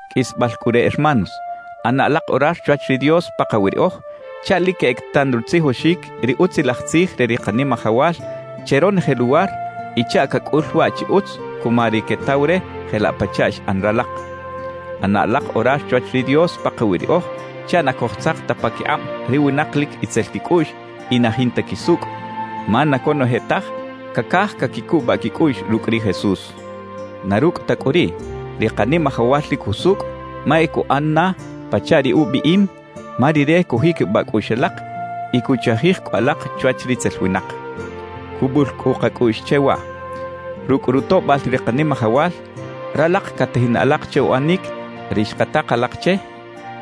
Qꞌuisbal cꞌu re, hermanos, ꞌana alak orar chwach ri Dios pakawi riꞌoj chaꞌ lic queꞌec tan rutzijoxic ri Utzilaj Tzij re ri Kanimajawal che ronoje luwar y chaꞌ cacꞌul waꞌ chi utz cuma ri quetaw re jelaꞌ pachaꞌ xꞌan ralak. ꞌAna alak orar chwach ri Dios pakawi riꞌoj chaꞌ na cojtzak ta paquikꞌab ri winak lic itzel quicꞌuꞌx y na jinta quisucꞌ, ma na conoje taj cacaj caquicubaꞌ quicꞌuꞌx rucꞌ ri Jesús. Na rucꞌ ta cꞌu riꞌ, ri Kanimajawal lic jusucꞌ ma e cuꞌan na pachaꞌ ri ubiꞌim, ma Rire cujiquibaꞌ cꞌuꞌx alak y cuchajij cꞌu alak chwach ritzel winak. Cubul cꞌu kacꞌuꞌx che waꞌ: Rucꞌ rutoꞌbal ri Kanimajawal, ralak catajin alak che uꞌanic ri xkatak alak che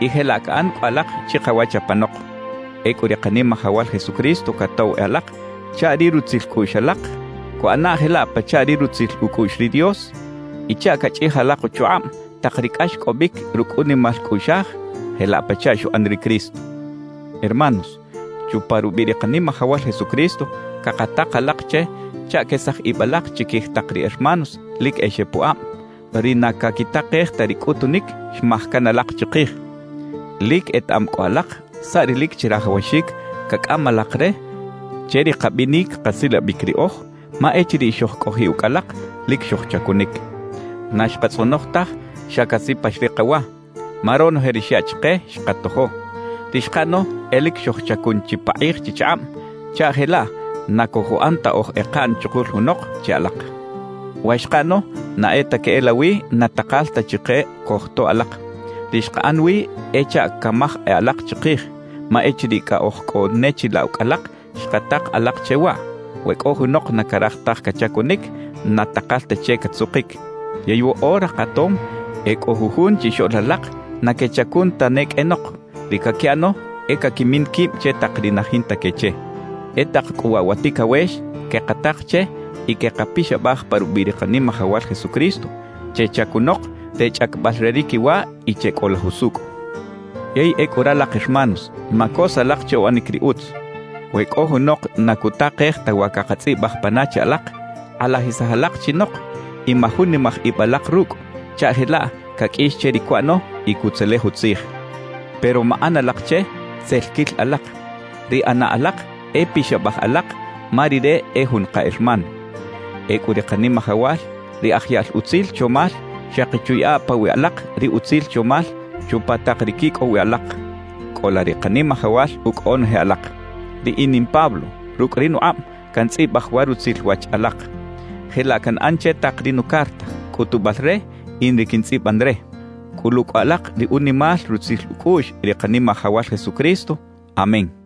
y jelaꞌ caꞌan cꞌu alak chikawach apanok. Ecꞌu ri Kanimajawal Jesucristo catoꞌw e alak chaꞌ ri rutzil cꞌuꞌx alak cuꞌana jelaꞌ pachaꞌ ri rutzil ucꞌuꞌx ri Dios y chaꞌ cachꞌij alak uchukꞌab tak ri cꞌaxcꞌobic rucꞌ unimal cꞌuꞌxaj jelaꞌ pachaꞌ xuꞌan ri Cristo. Hermanos, chupa rubiꞌ ri Kanimajawal Jesucristo cakatak alak che chaꞌ quesaj ib alak chiquij tak ri hermanos lic e xepuꞌab, ri na caquitakej ta ri cꞌutunic xmaj can alak chikij. Lic etaꞌam cꞌu alak saꞌ ri lic chirajawaxic cacꞌam alak re che ri kabinic kasilabic riꞌoj, ma echiriꞌ xojcꞌojiꞌ ucꞌ alak, lic xojchacunic. Na xkatzꞌonoj taj xa casipax ri kawa, ma ronoje ri xyaꞌ chike, xkatojo. Ri xkaꞌano e lic xojchacun chipakꞌij chichakꞌab chaꞌ jelaꞌ na cojuꞌan ta oj ekaꞌn chukul junok che alak. Wa xkaꞌano na e ta queꞌelawi na takal ta chike cojtoꞌ alak; ri xkaꞌan wi e chaꞌ camaj e alak chikij. Ma echiriꞌ cꞌa oj cꞌo ne chilaꞌ ucꞌ alak, xkatak alak che waꞌ: «We cꞌo junok na caraj taj cachacunic, na takal ta che catzukic.» Yey woꞌora katom, e cꞌo jujun chixoꞌl alak na quechacun tane qꞌuenok; ri caquiꞌano e caquimin quib che tak ri na jinta que che. E tak cꞌu waꞌ wa ticawex quekatak che y quekapixabaj pa rubiꞌ ri Kanimajawal Jesucristo: Chechacunok re chꞌacabal re ri quiwa y checꞌola jusucꞌ. Yey ecꞌu ralak hermanos, macos alak che uꞌanic ri utz. We cꞌo junok na cutakej ta wa cakatzꞌibaj pana che alak, kꞌalajisaj alak chinok y majunimaj ib alak rucꞌ, chaꞌ jelaꞌ caqꞌuix che ri cuꞌano y cutzelej utzij. Pero maꞌan alak che tzel quil alak; ri ꞌana alak e pixabaj alak ma rire e jun ka hermano. Ecꞌu ri Kanimajawal, ri aj yaꞌl utzil chomal, xaki chuyaꞌa pawiꞌ alak ri utzil chomal chupa tak ri quicꞌow wi alak. Cꞌola ri Kanimajawal ucꞌ onoje alak. Riꞌin in Pablo, rucꞌ ri nukꞌab cantzꞌibaj wa rutzil wach alak. Jelaꞌ canꞌan che tak ri nucarta, cꞌutubal re in ri quintzꞌiban re. Cꞌulu cꞌu alak ri unimal rutzil ucꞌuꞌx ri Kanimajawal Jesucristo. Amén.